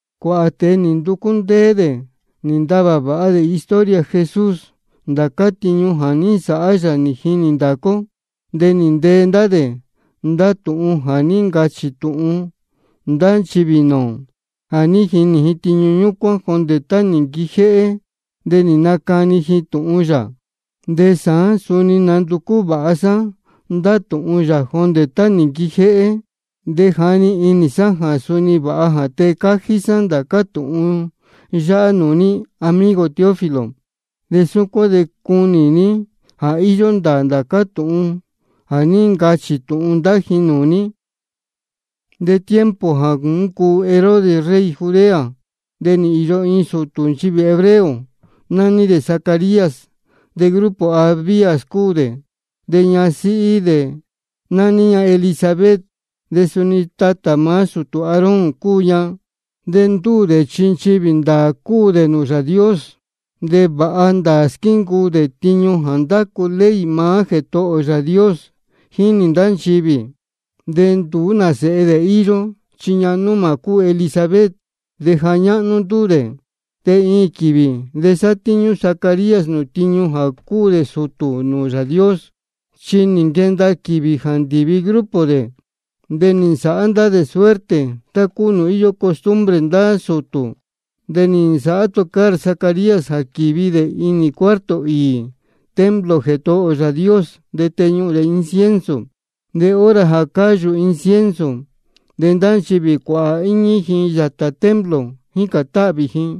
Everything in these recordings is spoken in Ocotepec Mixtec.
Cuāhā tēe nī nducú ndéé dē nī ntavā vāha dē historia Jesús, ndācá tiñu jā ní nsāhá yā nī jinī ndācá ó. De nī ntee ndá dē ndá tūhun jā ní ncachī tūhun ndá nchivī nūū ō, jā ní jinī ji tiñu ñúcuán jondē tá nī nquijéhé, de nī nacani ji tūhun yā. De sāán, suni nī nanducú vāha sá ndá tūhun yā jondē tá nī nquijéhé. De nī jani inī sá jā suni vāha jā tee cájí sá ndācá tūhun yáhá nūū ní, amigo Teófilo. De súcuán de cunī ní jā íyó ndāā ndācá tūhun jā ní ncachī tūhun ndá ji nūū ní. Tiempo jā ní ncuu Herodes rey Judea, de nī īyo iin sūtū nchivī hebreo, nání dē Zacarías, de grupo Abías cúu dē. De ñasíhí dē nání ña Elisabet, de suni tatā maá sūtū Aarón cúu ña. De ndúū dē chi nchivī ndāā cúu dē nūū Yāā Dios, de vāha ndāā squíncuu dē tiñu jā ndácu ley maá Jētohō ō Yāā Dios, jínī ndá nchivī. De nduú nā sēhe dē íyó, chi ñahan númā cúu Elisabet, de ja ñáhnú ndúū dē. De iin quīvī de sátíñú Zacarías nūū tiñu jā cúu dē sūtū nūū Yāā Dios, chi nī nquenda quīvī jā ndīvi grupo dē. De nī nsāhá ndá dē suerte tá cúu nūū íyó costumbre ndá sūtū. De nī nsāhá tocar Zacarías jā quīvi dē inī cuarto īī templo Jētohō ō Yāā Dios, de teñuhūn dē incienso. De hora jā cáyū incienso, de ndá nchivī cuāhā íñí ji yātā templo, jícān táhvī ji.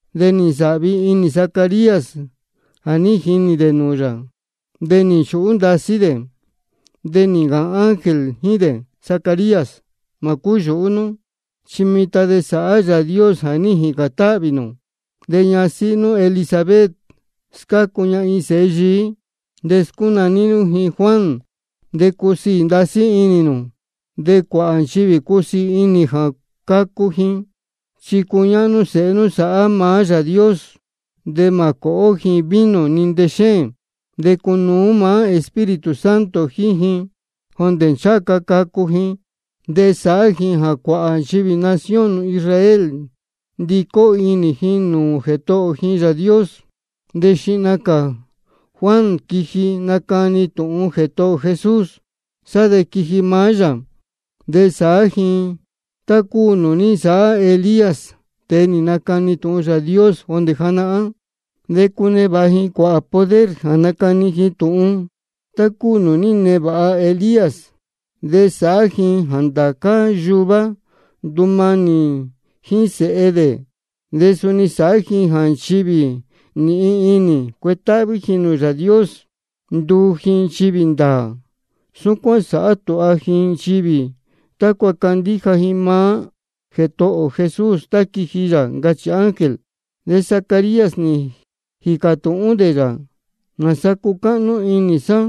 De nī ncunēhén inī Zacarías jā ní jinī dē nūū yā, de nī nchūhú ndasí dē. De nī ncāhān ángel jíín dē: Zacarías, mā cúyūhú nú, chi mitan de sāhá Yāā Dios jā ní jīcān táhvī nū. De ñasíhí nú Elisabet, scácu ña iin sēhe yií, de scúnaní nú ji Juan. De cusiī ndasí inī nū. De cuāhā nchivī cusiī inī jā cacu ji. Chi cuñáhnú sēhe nú sāhá maá Yāā Dios. De mā cōhó ji vino ni ntexéēn, de cunuú maá Espíritu Santo jíín ji jondē ncháha ca cacu ji. De sāhá ji jā cuāhā nchivī nación nū Israel ndicó inī ji nūū Jētohō ji Yāā Dios. De xihna cā Juan quiji, nacani tūhun Jētohō ō Jesús, sá de quiji maá yā. De sāhá ji tá cúu nūū ní nsāhá Elías, tēe nī nacani tūhun Yāā Dios jondē janahán, de cunevāha ji poder jā nacani ji tūhun, tá cúu nūū ní nevāha Elías. De sāhá ji jā ndācá yuvá ndumanī dē jíín sēhe dē. De suni sāhá ji jā nchivī nīhin inī cuetáhví ji nūū Yāā Dios, nduu ji nchivī ndāā. Súcuán sāhá tūha ji nchivī tácua candíja ji maá Jētohō ō Jesús tá quiji yā, ncachī ángel. De Zacarías nī jīcā tūhún dē yā: ¿Nāsa cucáhnú inī sá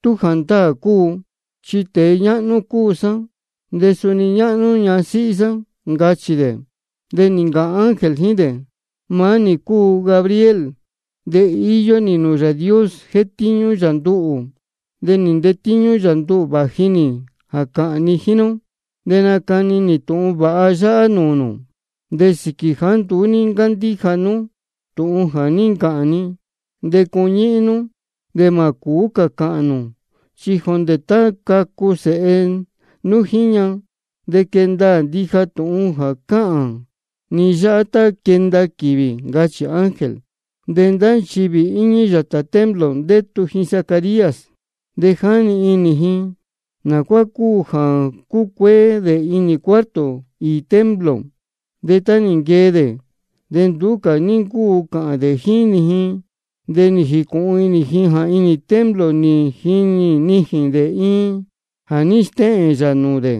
tú jāndáā cúu? Chi tēe ñáhnú cúu sá, de suni ñáhnú ñasíhí sá, ncachī dē. De nī ncāhān ángel jíín dē: Maá nī cúu Gabriel, de íyó nī nūū Yāā Dios, jétíñú yā nduhū. De nī ntetíñú yā nduhū vāji nī jā cāhān ni jíín nú, de nácani nī tūhun vāha yáhá nūū nū. De sīquī jāá nduú ní ncándíja nú tūhun jā ní ncāhān ni, de cuñíhín nú, de mā cūú cā cāhān nū, chi jondē tá cacu sēhe nú jíín ña. De quee ndaā ndija tūhun jā cáhān ni yáhá tá quenda quīvī, ncachī ángel. De ndá nchivī íñí yātā templo, ndétu ji Zacarías, de jáni inī ji nā cuá cúu jā cúcuéé dē inī cuarto īī templo. De tá nī nquee dē, de nduú cā ní ncúu cāhān dē jíín ji. De nī jīcūhun inī ji jā inī templo nī jinī nijīn dē iin jā ní stéhēn yā nūū dē.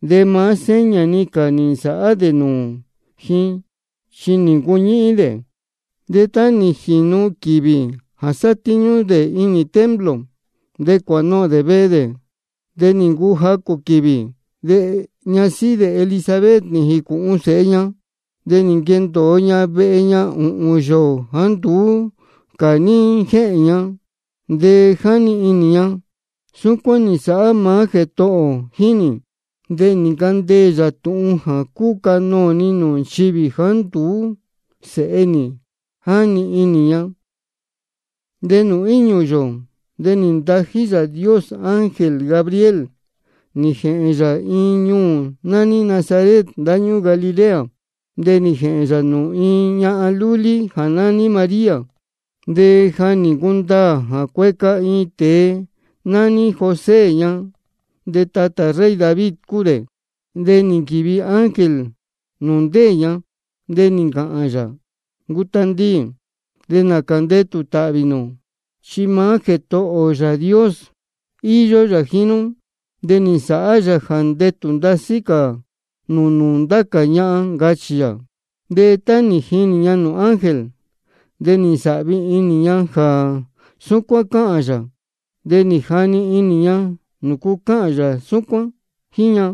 De maá seña-ni cā nī nsāhá dē nūū ji, chi nī ncuñíhín dē. De tá nī jīnu quīvī jā sátíñú dē inī templo, de cuānohōn dē vehe dē. De nī ncuu jacū quīvī, de ñasíhí dē Elisabet nī jīcūhun sēhe ña. De nī nquendōo ña vehe ña ūhūn yōō jāá nduú cā ní jéhēn ña. De jáni inī ña: Súcuán nī nsāhá maá Jētohō ō jíín nī, de nī ncandeē yā tūhun jā cúcanoō ni nūū nchivī jāá nduú sēhe nī, jáni inī ña. De nūū íñū yōō, de nī ntají Yāā Dios ángel Gabriel, nī jēhēn yā iin ñuū nání Nazaret, ndáñúū Galilea. De nī jēhēn yā nūū iin ñahan lúlí jā nání María. De ja nī ncundaā jā cueca iin tēe nání José ña, de tatā rey David cúu dē. De nī nquīvi ángel nūū ndéē ña, de nī ncāhān yā: Ncu tandiī, de nācā ndetū tāhvī nū. Chi maá Jētohō ō Yāā Dios íyó yā jíín nú, de nī nsāhá yā jā ndetū ndasí cā nū nūū ndá cā ñahan, ncachī yā. De tá nī jinī ña nūū ángel, de nī ncunēhén inī ña jā súcuán cáhān yā, de nī jani inī ña nūcu cáhān yā súcuán jíín ña.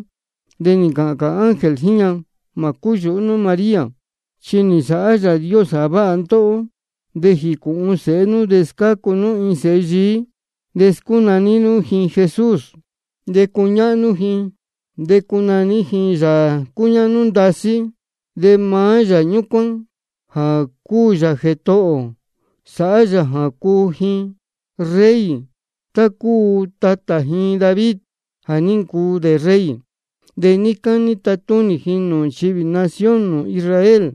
De nī ncāhān cā ángel jíín ña: Mā cúyūhú nú María, chi nī nsāhá Yāā Dios jā váha ndóhó. De jīcūhun sēhe nú de scácu nú iin sēhe yií, de scúnaní nú ji Jesús. De cuñáhnú ji, de cunaní ji Sēhe Yāā cúñáhnú ndasí. De maá Yāā ñúcuán jā cúu yā Jētohō ō sāhá yā jā cuu ji rey, tá cúu tatā ji David jā ní ncuu dē rey. De níí cání tatúnī ji nūū nchivī nación nū Israel.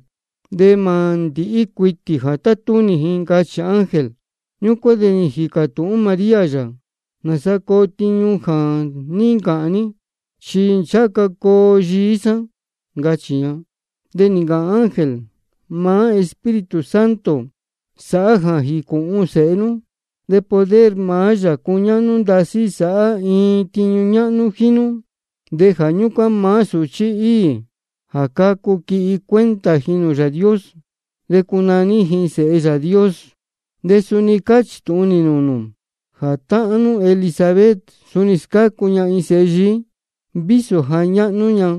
De mā ndīhí cuitī jā tatúnī ji, ncachī ángel. Ñúcuán de nī jīcā tūhún María yā: ¿Nāsa coo tiñu jā ní ncāhān ní? Chi ncháha ca coo yií sá, ncachī ña. De nī ncāhān ángel: Maá Espíritu Santo sāhá jā jīcūhun sēhe nú, de poder maá Yāā cúñáhnú ndasí sāhá iin tiñu ñáhnú jíín nú. De jā ñúcuán maá sūchí īī jā cacu, quihi cuenta ji nūū Yāā Dios, de cunaní ji Sēhe Yāā Dios. De suni cáchī tūhun nī nūū nū jā táhán nú Elisabet, suni scácu ña iin sēhe yií, vísō ja ñáhnú ña.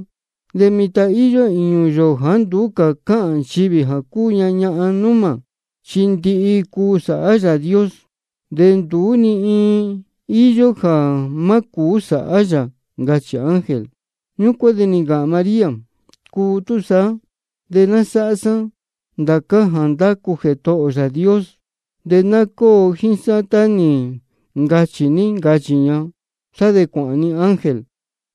De mitan íyó īñū yōō jāá nduú cā cáhān nchivī jā cúu ña ñahan númā. Chi ndihi-ni cuu sāhá Yāā Dios, de nduú ni iin íyó jā má cūú sāhá yā, ncachī ángel. Ñúcuán de nī ncāhān María: Cuu túsaá, de ná sáhá sá ndācá jā ndácu Jētohō ō Yāā Dios, de ná cóo jíín sá tá nī ncachī ní, ncachī ña. Sá de cuāhān-ni ángel.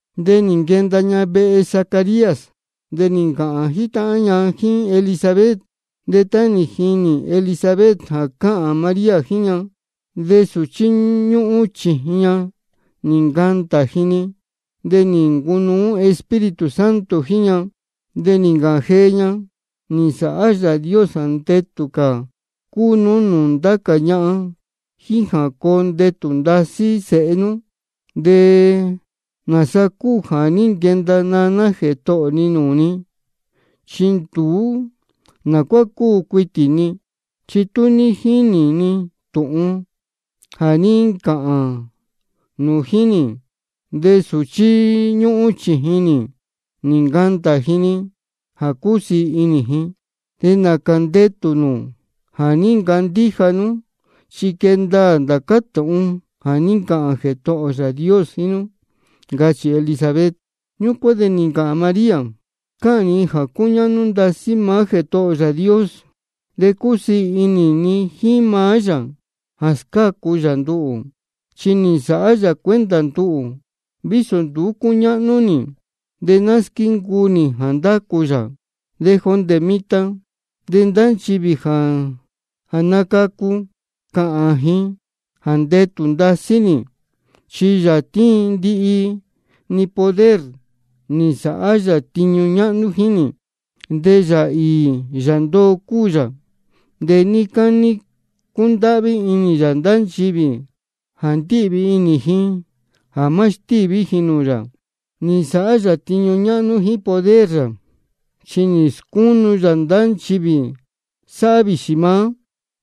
De nī jīnū ña vehe Zacarías, de nī ncāhān jítáhán ña jíín Elisabet. De tá nī jini Elisabet jā cáhān María jíín ña, de sūchí ñúhún chījin ña nī ncandā ji-ni. De nī ncunuú Espíritu Santo jíín ña. De nī ncāhān jee ña: Nī nsāhá Yāā Dios jā ndetū cā cúu nú nūū ndá cā ñahan, jíín jā coo ndetū ndasí sēhe nú. ¿De nāsa cúu jā ní nquenda naná Jētohō ni nūū ni? Chi nduú ná cúu cuitī ni. Chi tá nī jini nī tūhun jā ní ncāhān nū jíín nī, de sūchí ñúhún chījin nī nī ncandā ji-ni jā cúsiī inī ji. De nācā ndetū nū jā ní ncandíja nú, chi quee ndaā ndācá tūhun jā ní ncāhān Jētohō ō Yāā Dios jíín nú, ncachī Elisabet. Ñúcuán de nī ncāhān María: Cáhān ni jā cúñáhnú ndasí maá Jētohō ō Yāā Dios, de cúsiī inī ni jíín maá yā jā scácu yā nduhū. Chi nī nsāhá yā cuenta nduhū, vísō nduú cúñáhnú nī. De ná squíncuu nī jā ndácu yā. De jondē mitan de ndá nchivī jā nacacu, cāhān ji jā ndetū ndasí nī. Chi Yāā tíin ndihi-ni poder, nī nsāhá yā tiñu ñáhnú jíín nī. De Yāā īī Yāā ndoo cúu yā. De níí cání cundáhví inī yā ndá nchivī jā ndíhvī inī ji jā má stíví ji nūū yā. Nī nsāhá yā tiñu ñáhnú jíín poder yā, chi nī scúnu yā ndá nchivī sáhá vīxī maá,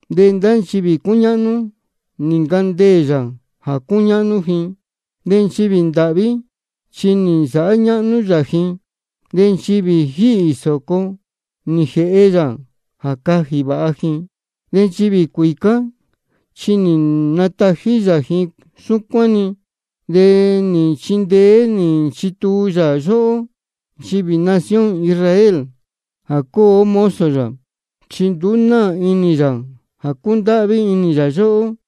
de ndá nchivī cúñáhnú, nī ncandeē yā jā cúñáhnú ji. De nchivī ndāhví, chi nī nsāhá ñáhnú yā ji, de nchivī jíhī sōco, nī jēhe yā jā cajī vāha ji, de nchivī cuīcá, chi nī natají yā ji súcuán-ni. De nī nchindeé nī nchituu yā yóhó nchivī nación Israel, jā cúu ó mozo yā, chi nduú náā inī yā jā cúndáhví inī yā yóhó.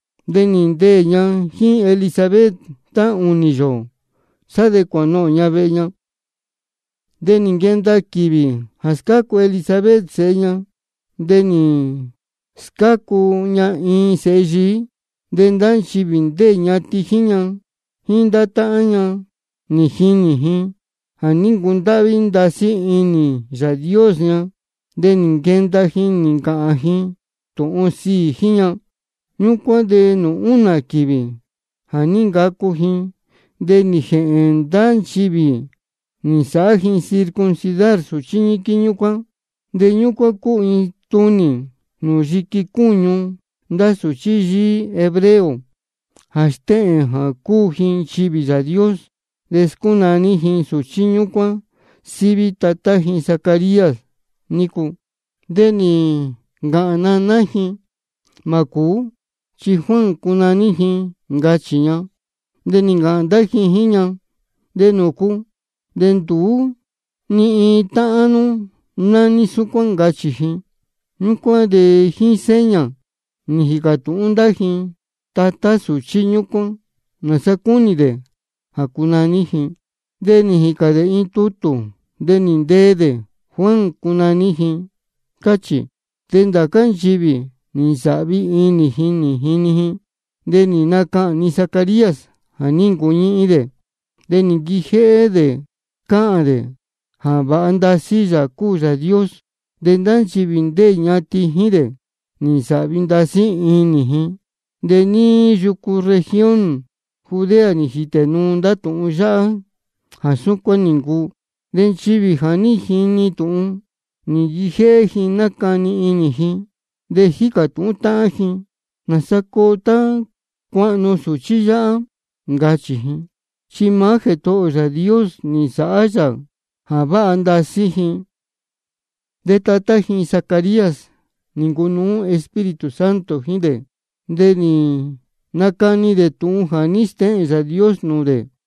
De nī ndeē ña jíín Elisabet tá ūnī yōō. Sá de cuānohōn ña vehe ña. De nī nquenda quīvī jā scácu Elisabet sēhe ña, de nī scácu ña iin sēhe yií. De ndá nchivī ndéē ñatin jíín ña jíín ndá táhán ña, nī jinī ji jā ní ncundáhví ndasí inī Yāā Dios ña, de nī nquenda ji nī ncāhān ji tūhun sīī jíín ña. Ñúcuán de nūū únā quīvī jā ní ncacu ji, de nī jēhēn ndá nchivī nī nsāhá ji circuncidar sūchí ñíquín ñúcuán. (De ñúcuán cúu iin tunī nūū yiqui cúñu ndá sūchí yíí hebreo jā stéhēn jā cúu ji nchivī Yāā Dios.) De scúnaní ji sūchí ñúcuán síví tatá ji Zacarías nícu. De nī ncāhān naná ji: Mā cūú, chi Juan cunaní ji, ncachī ña. De nī ncāhān ndá ji jíín ña: ¿De nūcu? De nduú ni iin táhán nú nání súcuán, ncachī ji. Ñúcuán de jíín seña nī jīcā tūhún ndá ji tatá sūchí ñúcuán nāsa cúnī dē jā cunaní ji. De nī jīcān dē iin tutū, de nī ntee dē: Juan cunaní ji, cáchī. De ndācá nchivī nī nsāhvi inī ji nī jinī ji. De nī nacahān-ni Zacarías jā ní ncuñíhín dē, de nī nquijéhé dē cáhān dē jā vāha ndasí Yāā cúu Yāā Dios. De ndá nchivī ndéē ñatin jíín dē, nī nsāhvi ndasí inī ji. De níí yucu región Judea nī jītē nuu ndá tūhun yáhá jā súcuán nī ncuu. De nchivī jā ní jini tūhun, nī nquijéhé ji nácani inī ji, de jícā tūhún táhán ji: ¿Nāsa coo tá cuahnu sūchí yáhá? ncachī ji. Chi maá Jētohō ō Yāā Dios nī nsāhá yā jā váha ndasí ji. De tatá ji Zacarías nī ncunuú Espíritu Santo jíín dē, de nī nacani dē tūhun jā ní stéhēn Yāā Dios nūū dē: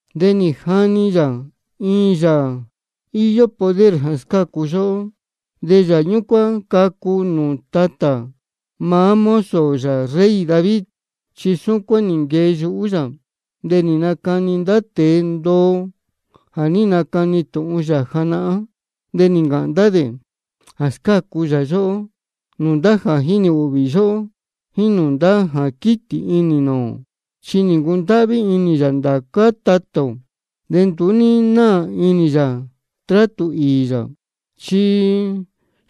De nī jani yā iin Yāā íyó poder jā scácu yóhó, de Yāā ñúcuán cacu nūū tatā maá mozo yā rey David. Chi súcuán nī nquee yuhú yā, de nī nacani ndá tēe ndoo jā ní nacani tūhun yā janahán. De nī ncāhān ndá dē jā scácu yā yóhó nūū ndá jā jínī ūhvī yóhó, jíín nūū ndá jā quítī inī nūū ō. Chi nī ncundáhví inī yā ndācá tatā ō, de nduú ní náā inī yā trátū īī yā. Chi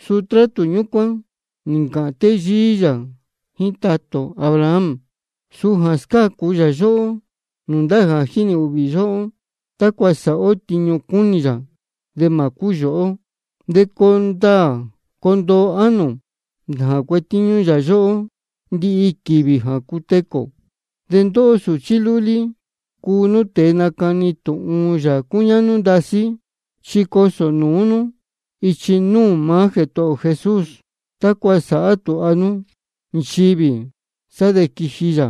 suu trátū ñúcuán nī ncāhān téyíí yā jíín tatā ō Abraham, suu jā scácu yā yóhó nūū ndá jā jínī ūhvī yóhó, tácua sāhá ó tiñu cúnī yā de mā cúyūhú ó, de coo ndāā coo ndoo ánō ō jā cuetíñú yā yóhó ndihi quīvī jā cutecū ō. De ndóhó sūchí lúlí, cuu nú tēe nacani tūhun Yāā cúñáhnú ndasí. Chi cosō nūú nú ichi núū maá Jētohō ō Jesús, tácua sāhá tūha nú nchivī, sá de quiji yā.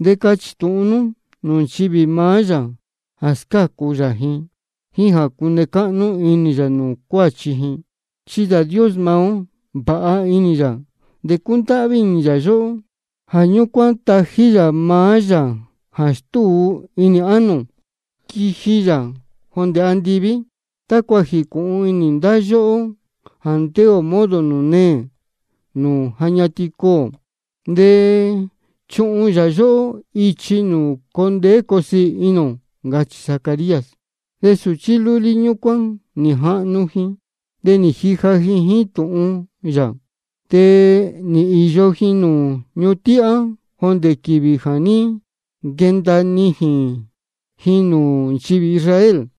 De cachī tūhun nú nūū nchivī maá yā jā scácu yā ji, jíín jā cune cáhnú inī yā nūū cuāchi ji. Chi Yāā Dios maá ó, vāha inī yā de cúndáhví inī yā yóhó. Jā ñúcuán tají yā maá Yāā jā stúu inī ánō ō, quiji yā jondē andiví, tácua jīcūhun inī ndá yóhó jā ndéē ō modo nūū neē nūū ja ñatin cuū ō. De chuhun yā yóhó ichi nūū coo ndeé coo siī inī ō. Ncachī Zacarías. De sūchí lúlí ñúcuán nī jahnu ji de nī jija ji jíín tūhun yā. De nī īyo ji nūū ñuhun tíhá jondē quīvī jā ní nquenda nijīn ji nūū nchivī Israel.